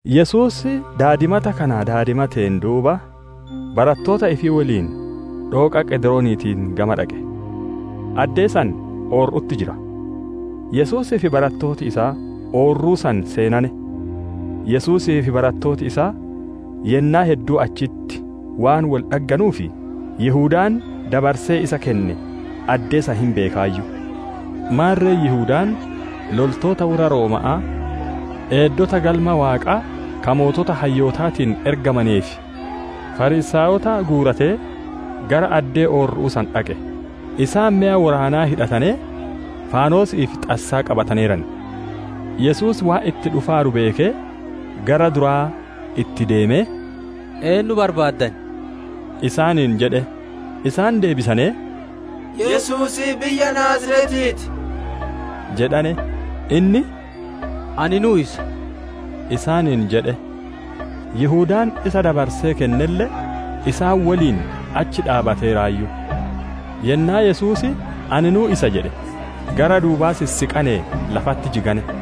Yesuus daadimata kana daadimateen duuba, barattoota ifii woliin dhooqa Qedirooniitiin gama dhaqe. Addee san oorru'utti jira. Yesuusii fi barattooti isaa oorruu san seenane. Yesuusii fi barattooti isaa yennaa hedduu achitti waan wol dhagganuuf, Yihudaan dabarsee isa kenne addee san hin beekaayyu. Maarre Yihudaan loltoota worra Rooma'aa, eeddota Galma Waaqaa ka sooreyyii hayyootaatiin ergamanee fi Fariisaayota guuratee gara addee oorru'uu san dhaqe; isaan meya woraanaa hidhatanee faanosi'ii fi xassaa qabataneeran. Yesuus waan itti dhufaaru beekee, gara duraa itti deemee, «Eennu barbaaddan?» isaaniin jedhe. Isaan deebisanee, «Yesuusii biyya Naaziretii ti» jedhane. Inni, «Aninuu isa» isaaniin jedhe. Yihudaan isa dabarsee kennelle isaan woliin achi dhaabbateeraayyu. Yennaa Yesuus, «Aninuu isa» jedhe gara duubaa sissiqanee lafatti jigane.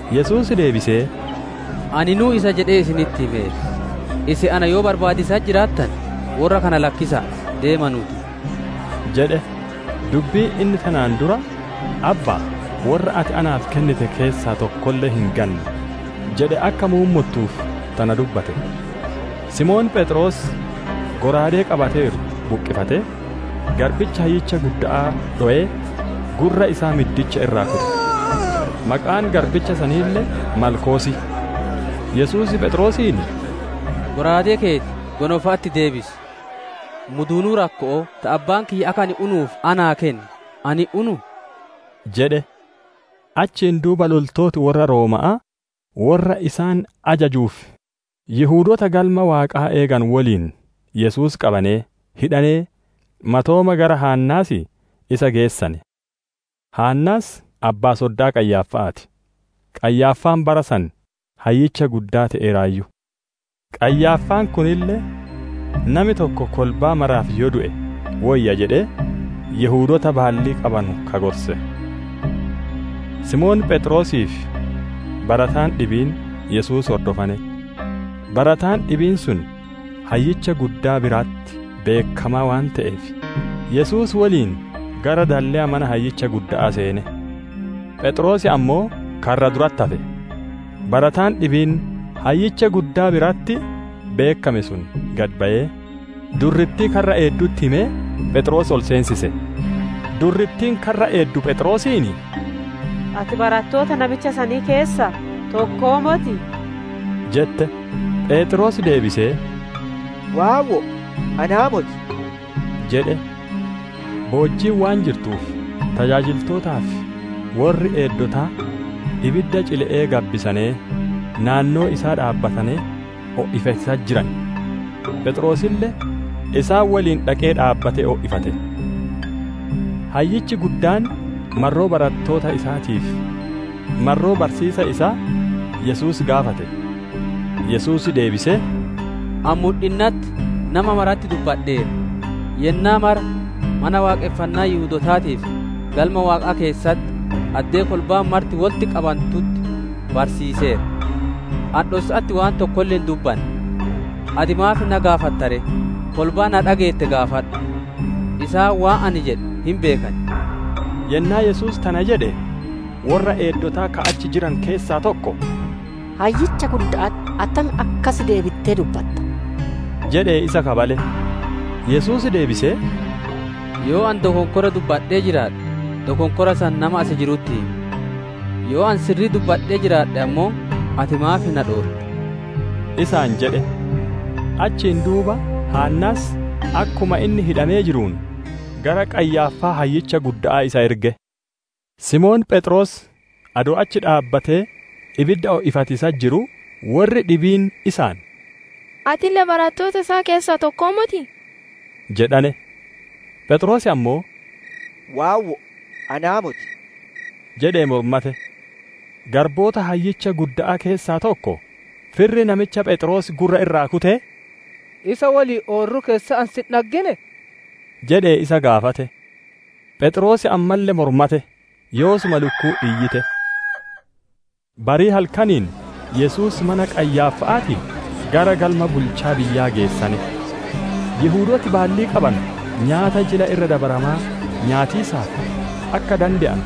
Yesuus deebisee, « ‹Aninuu isa› jedhee isinitti himeera. Isin, na yoo barbaadiisatti jiraattane, worra kana lakkisa'a deemanuu ti» jedhe. Dubbiin inni tanaan dura, «Abba'a, worra ati naaf kennite keessaa tokkolle hin ganne» jedhe akka muummottuuf tana dubbate. Simoon Pheexroos, shallaagaa qabateeru buqqifatee, garbicha hayyicha gudda'aa dhowee, gurra isaa middicha irraa kute. Maqaan garbicha saniille Maalkoos. Yesuus Pheexroosiin, «Shallaagaa keeti gonofa'atti deebisi! Muduunuu rakko'oo ta Abbaan kiyya akka ani unuuf naaf kenne ani hin unuu?» jedhe. Achiin duuba loltooti worra Rooma'aa worra isaan ajajuu fi Yihudoota Galma Waaqaa eeganu woliin Yesuus qabanee, hidhanee, matooma gara Haannaas isa geessane. Haannaas abbaa-soddaa Qayyaaffa'aa ti; Qayyaaffaan bara san Hayyicha Guddaa te'eeraayyu. Qayyaaffaan kunille, nami tokko kolbaa maraaf yoo du'e woyya jedhee Yihudoota baallii qabanu ka gorse. Simoon Pheexroosii fi barataan dhibiin Yesuus hordofane. Barataan dhibiin sun Hayyicha Guddaa biratti beekkamaa waan te'eef, Yesuus woliin gara dalleya mana hayyicha gudda'aa seene. Pheexroos ammoo karra duratti hafe. Barataan dhibiin, Hayyicha Guddaa biratti beekkame sun gad bayee, durrittii karra eeddutti himee, Pheexroos ol seensise. Durrittiin karra eeddu Pheexroosiin, «Ati barattoota namicha sanii keessaa tokkoo motii?» jette. Pheexroos deebisee, «Waawwo'o, anaa moti» jedhe. Boojjiin waan jirtuuf, tajaajiltootaa fi worri eeddotaa ibidda cile'ee gabbisanee, naannoo isaa dhaabbatanee, o'ifatiisatti jiran. Pheexroosille isaan woliin dhaqee dhaabbatee o'ifate. Hayyichi guddaan marroo barattoota isaatii fi marroo barsiisa isaa Yesuus gaafate. Yesuus deebisee, «Ani mudhinnatti nama maratti dubbadheera; yennaa mara mana Waaqonfannaa Yihudootaatii fi Galma Waaqaa keessatti addee kolbaan marti wolitti qabantutti barsiiseera. Ani dhossa'atti waan tokkolle hin dubbanne. Ati maaf na gaafatta ree? Kolbaa na dhageette gaafadhu. Isaan waan ani jedhe hin beekan» jedheen. Yennaa Yesuus tana jedhe, worra eeddotaa ka achi jiranu keessaa tokko, «Hayyicha gudda'atti attam akkas deebittee dubbatta?» jedhee isa kabale. Yesuus deebisee, «Yoo ani dokonkora dubbadhee jiraadhe, dokonkora san nama as jirutti himi. Yoo ani sirrii dubbadhee jiraadhe ammoo ati maaf na dhootta?» isaan jedhe. Achiin duuba Haannaas, akkuma inni hidhamee jiruun, gara Qayyaaffaa hayyicha gudda'aa isa erge. Simoon Pheexroos adoo achi dhaabbatee ibidda o'ifatiisatti jiruu, worri dhibiin isaan, «Atille barattoota isaa keessaa tokkoo motii?» isaan jedhane. Pheexroos ammoo, «Waawwo'o, anaa moti» jedhee mormate. Garboota hayyicha gudda'aa keessaa tokko, firri namicha Pheexroos gurra irraa kutee, «Isa woliin oorruu keessatti ani si hin dhagginee?» jedhee isa gaafate. Pheexroos ammalle mormate; yoosuma lukkuun iyyite. Barii halkaniin Yesuus mana Qayyaaffa'aatii gara galma bulchaa biyyaa geessane. Yihudooti baalli qabanu nyaata Jila Irra Dabaramaa nyaatiisaaf akka dande'anu,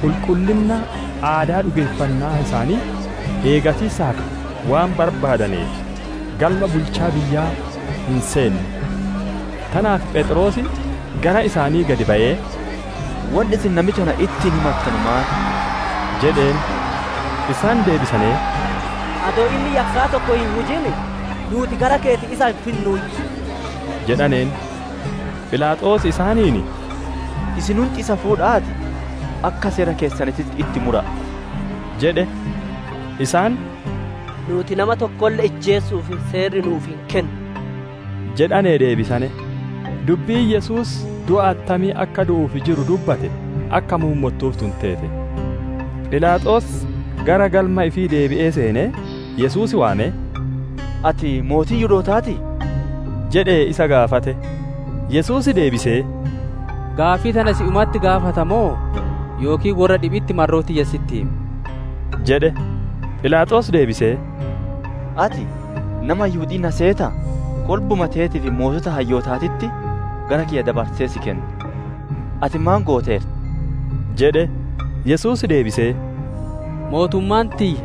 qulqullinna aadaa dhugeeffannaa isaanii eegatiisaaf waan barbaadaneef, galma bulchaa biyyaa hin seenne. Tanaaf Philaaxoos gara isaanii gad bayee, «Wonni isin namicha kana ittiin himattanu maan?» jedheen. Isaan deebisanee, «Adoo inni yakkaa tokko hin hujin nuuti gara keeti isa hin finnuuyyu» jedhaneen. Philaaxoos isaaniin, «Isinunti isa fuudha'aatii, akka seera keessaniititti itti mura'a» jedhe. Isaan, «Nuuti nama tokkolle ijjeesu'uuf seerri nuuf hin kennu» jedhanee deebisane. Dubbiin Yesuus du'a attamii akka du'uuf jiru dubbate akka muummottuuf tun teete. Philaaxoos gara galma ifii deebi'ee seenee, Yesuus waamee, «Ati mootii Yihudootaatii?» jedhee isa gaafate. Yesuus deebisee, «Gaaffii tana si'umatti gaafata moo yookiin worra dhibi'itti marroo tiyya sitti hime?» jedhe. Philaaxoos deebisee, «Ati nama Yihudi'ii na seetaa? Kolbuma teetii fi sooreyyii hayyootaatitti gara kiyya dabarsee si kenne. Ati maan gooteerta?» jedhe. Yesuus deebisee, «Mootummaan tiyya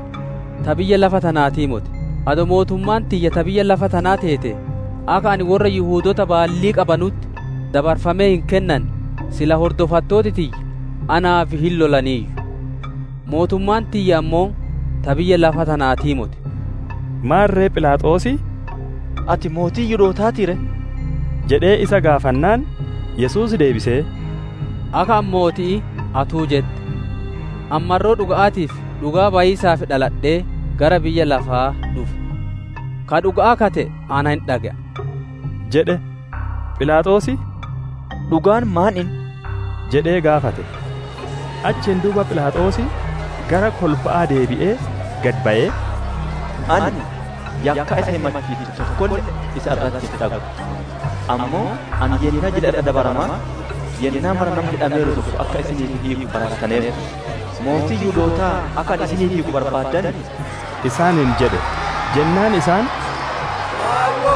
ta biyya lafa tanaatii moti; adoo mootummaan tiyya ta biyya lafa tanaa teetee, akka ani worra Yihudoota baallii qabanutti dabarfamee hin kennanne, silaa hordofattooti tiyya naaf hin lolaniiyyu. Mootummaan tiyya ammoo ta biyya lafa tanaatii moti» jedhe. Maarre Philaaxoos, «Ati mootii Yihudootaatii ree?» jedhee isa gaafannaan, Yesuus deebisee, «Akka ani mooti'ii atinuu jette. Ani marroo dhuga'aatiif dhugaa bayiisaaf dhaladhee, gara biyya lafaa dhufe. Ka dhuga'aa ka te'e na hin dhage'a» jedhe. Philaaxoos, «Dhugaan maan inni?» jedhee gaafate. Achiin duuba Philaaxoos gara kolba'aa deebi'ee gad bayee, «Ani yakkaa isa himachiittu tokkolle isa irratti hin dhaggu. Ammoo ani yennaa Jila Irra Dabaramaa, yennaa mara nama hidhameeru tokko akka isinii hiiku barattaneertan. Mootii Yihudootaa akka ani isiniif hiiku barbaaddanii?» isaaniin jedhe. Jennaan isaan, «Waawwo'o,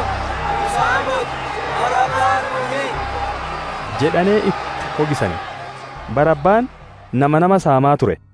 isaa moti! Barabbaa nuu hiiki!» jedhane itti hogisane; Barabbaan nama nama saamaa ture.